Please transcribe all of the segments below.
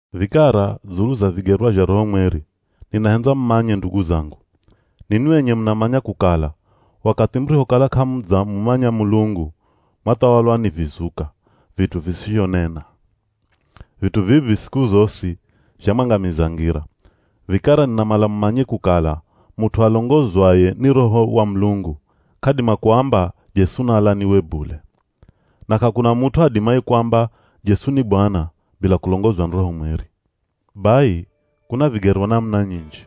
Vikara dzulu za vigerwa zha Roho Mweri, ninahendza mumanye ndugu zangu. Ninwi enye munamanya kukala, wakathi murihokala k'amudzamumanya Mulungu mwathawalwa ni vizuka, vit'u visizhonena. Vit'u vivi siku zosi zhamwangamiza ngira. Vikara ninamala mumanye kukala mut'u alongozwaye ni Roho wa Mulungu, k'adima kuamba, “Jesu naalaniwe” bule. Na k'akuna mut'u adimaye kuamba “Jesu ni Bwana” bila kulongozwa ni Roho Mweri. Bai, kuna vigerwa namuna nyinji,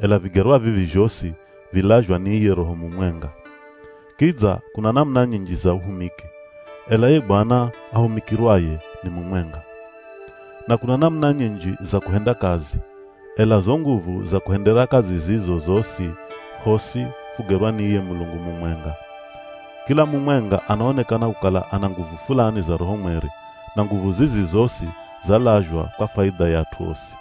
ela vigerwa vivi zhosi vilazhwa ni iye Roho mumwenga. Kidza kuna namuna nyinji za uhumiki, ela ye Bwana ahumikirwaye ni mumwenga. Na kuna namuna nyinji za kuhenda kazi ela zo nguvu za kuhendera kazi zizo zosi, hosi fugerwa ni iye Mulungu mumwenga. Kila mumwenga anaonekana kukala ana nguvu fulani za Roho Mweri, na nguvu zizi zosi zalazhwa kwa faidha ya at'u osi.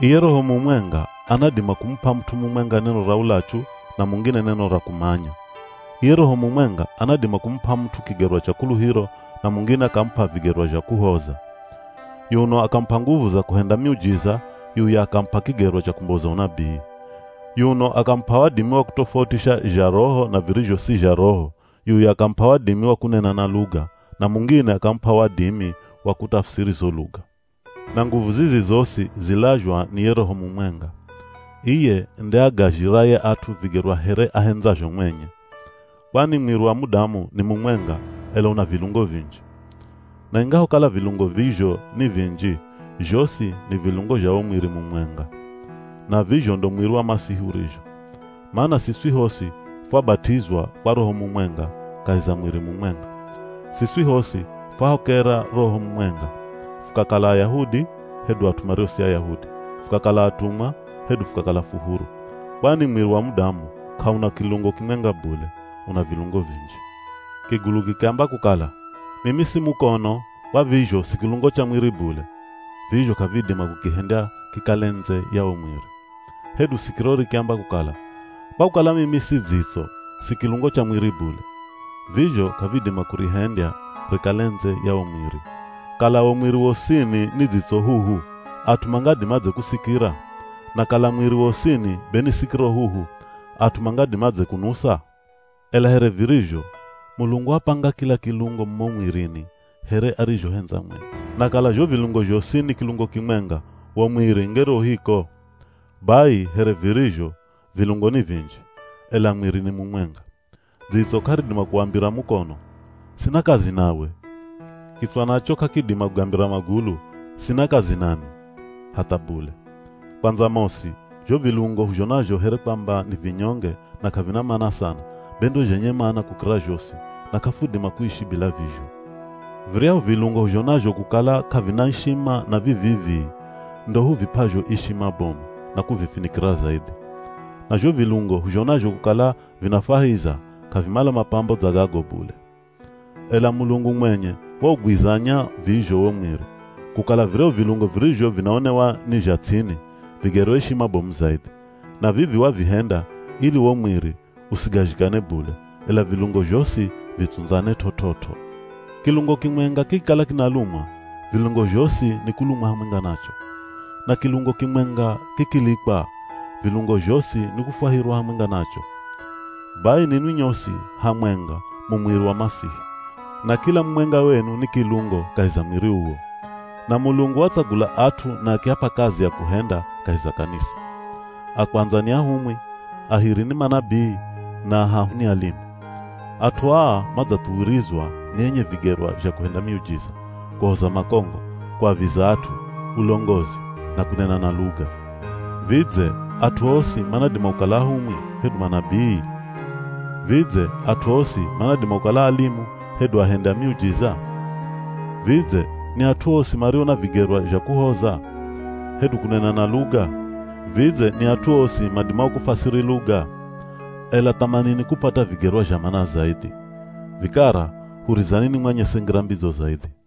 Iye Roho mumwenga anadima kumup'a mut'u mumwenga neno ra ulachu, na mungine neno ra kumanya. Iye Roho mumwenga anadima kumup'a mut'u kigerwa cha kuluhiro, na mungine akamup'a vigerwa zha kuhoza. Yuno akamup'a nguvu za kuhenda miujiza, yuya akamup'a kigerwa cha kumboza unabii. Yuno akamup'a wadimi wa kutofautisha zha Roho na virizho si zha Roho, yuya akamup'a wadimi wa kunena na luga, na mungine akamup'a wadimi wa kutafusiri zo luga. Na nguvu zizi zosi zilazhwa ni ye Roho mumwenga. Iye nde agazhiraye at'u vigerwa here ahendzazho mwenye. Kwani mwiri wa mudamu ni mumwenga ela una vilungo vinji. Na ingahokala vilungo vizho ni vinji, zhosi ni vilungo zha wo mwiri mumwenga. Na vizho ndo mwiri wa Masihi urizho. Mana siswi hosi fwabat'izwa kwa Roho mumwenga kahi za mwiri mumwenga. Siswi hosi fwahokera Roho mumwenga, fukakala Ayahudi, hedu at'u mario si Ayahudi, fukakala atumwa hedu fukakala fu huru. Kwani mwiri wa mudamu k'auna kilungo kimwenga bule, una vilungo vinji. Kigulu kikiamba kukala, “Mimi si mukono, kwa vizho si kilungo cha mwiri bule.” Vizho k'avidima kukihendya kikale ndze ya wo mwiri. Hedu sikiro rikiamba kukala, “Kwa kukala mimi si dzitso, si kilungo cha mwiri bule.” Vizho k'avidima kurihendya rikale ndze ya wo mwiri. Kala wo mwiri wosini ni dzitso huhu, at'u mangadimadze kusikira? Na kala mwiri wosini be ni sikiro huhu, at'u mangadimadze kunusa? Ela here virizho, Mulungu wapanga kila kilungo mumo mwirini here arizhohendza mwenye. Na kala zho vilungo zhosi ni kilungo kimwenga, wo mwiri ngere u hiko? Bai, here virizho, vilungo ni vinji, ela mwiri ni mumwenga. Dzitso k'aridima kuwambira mukono, “Sina kazi nawe!” Kitswa nacho k'akidima kugambira magulu, “Sina kazi nanwi!” Hatha bule! Kwandza mosi, zho vilungo huzhonazho here kwamba ni vinyonge na k'avina mana sana, be ndo zhenye mana kukira zhosi, na k'afudima kuishi bila vizho. Viryahu vilungo huzhonazho kukala k'avina ishima na vi vii-vii, ndo huvip'azho ishima bomu, na kuvifinikira zaidhi. Na zho vilungo huzhonazho kukala vinafwahiza, k'avimala mapambo dza gago bule. Ela Mulungu mwenye waugwizanya vizho wo mwiri, kukala viryahu vilungo virizho vinaonewa ni zha ts'ini, vigerwe ishima bomu zaidhi. Na vivi wavihenda ili wo mwiri usigazhikane bule, ela vilungo zhosi vitsundzane t'ot'ot'o. Kilungo kimwenga kikikala kinalumwa, vilungo zhosi nikulumwa hamwenga nacho. Na kilungo kimwenga kikilikwa, vilungo zhosi nikufwahirwa hamwenga nacho. Bai, ninwi nyosi hamwenga mu mwiri wa Masihi, na kila mumwenga wenu ni kilungo kahi za mwiri uwo. Na Mulungu watsagula at'u na akiap'a kazi ya kuhenda kahi za kanisa. A kwandza ni ahumwi, a hiri ni manabii na a hahu ni alimu. At'u aa madzathuwirizwa ni enye vigerwa zha kuhenda miujiza, kuhoza makongo, kuaviza at'u, ulongozi, na kunena na luga. Vidze at'u osi manadima kukala ahumwi, hedu manabii? Vidze at'u osi manadima kukala alimu, hedu ahendi a miujiza? Vidze ni at'u osi mario na vigerwa zha kuhoza? Hedu kunena na luga? Vidze ni at'u osi madimao kufasiri luga? Ela thamanini kupata vigerwa zha mana zaidhi. Vikara hurizani nimwanyese ngira mbidzo zaidhi.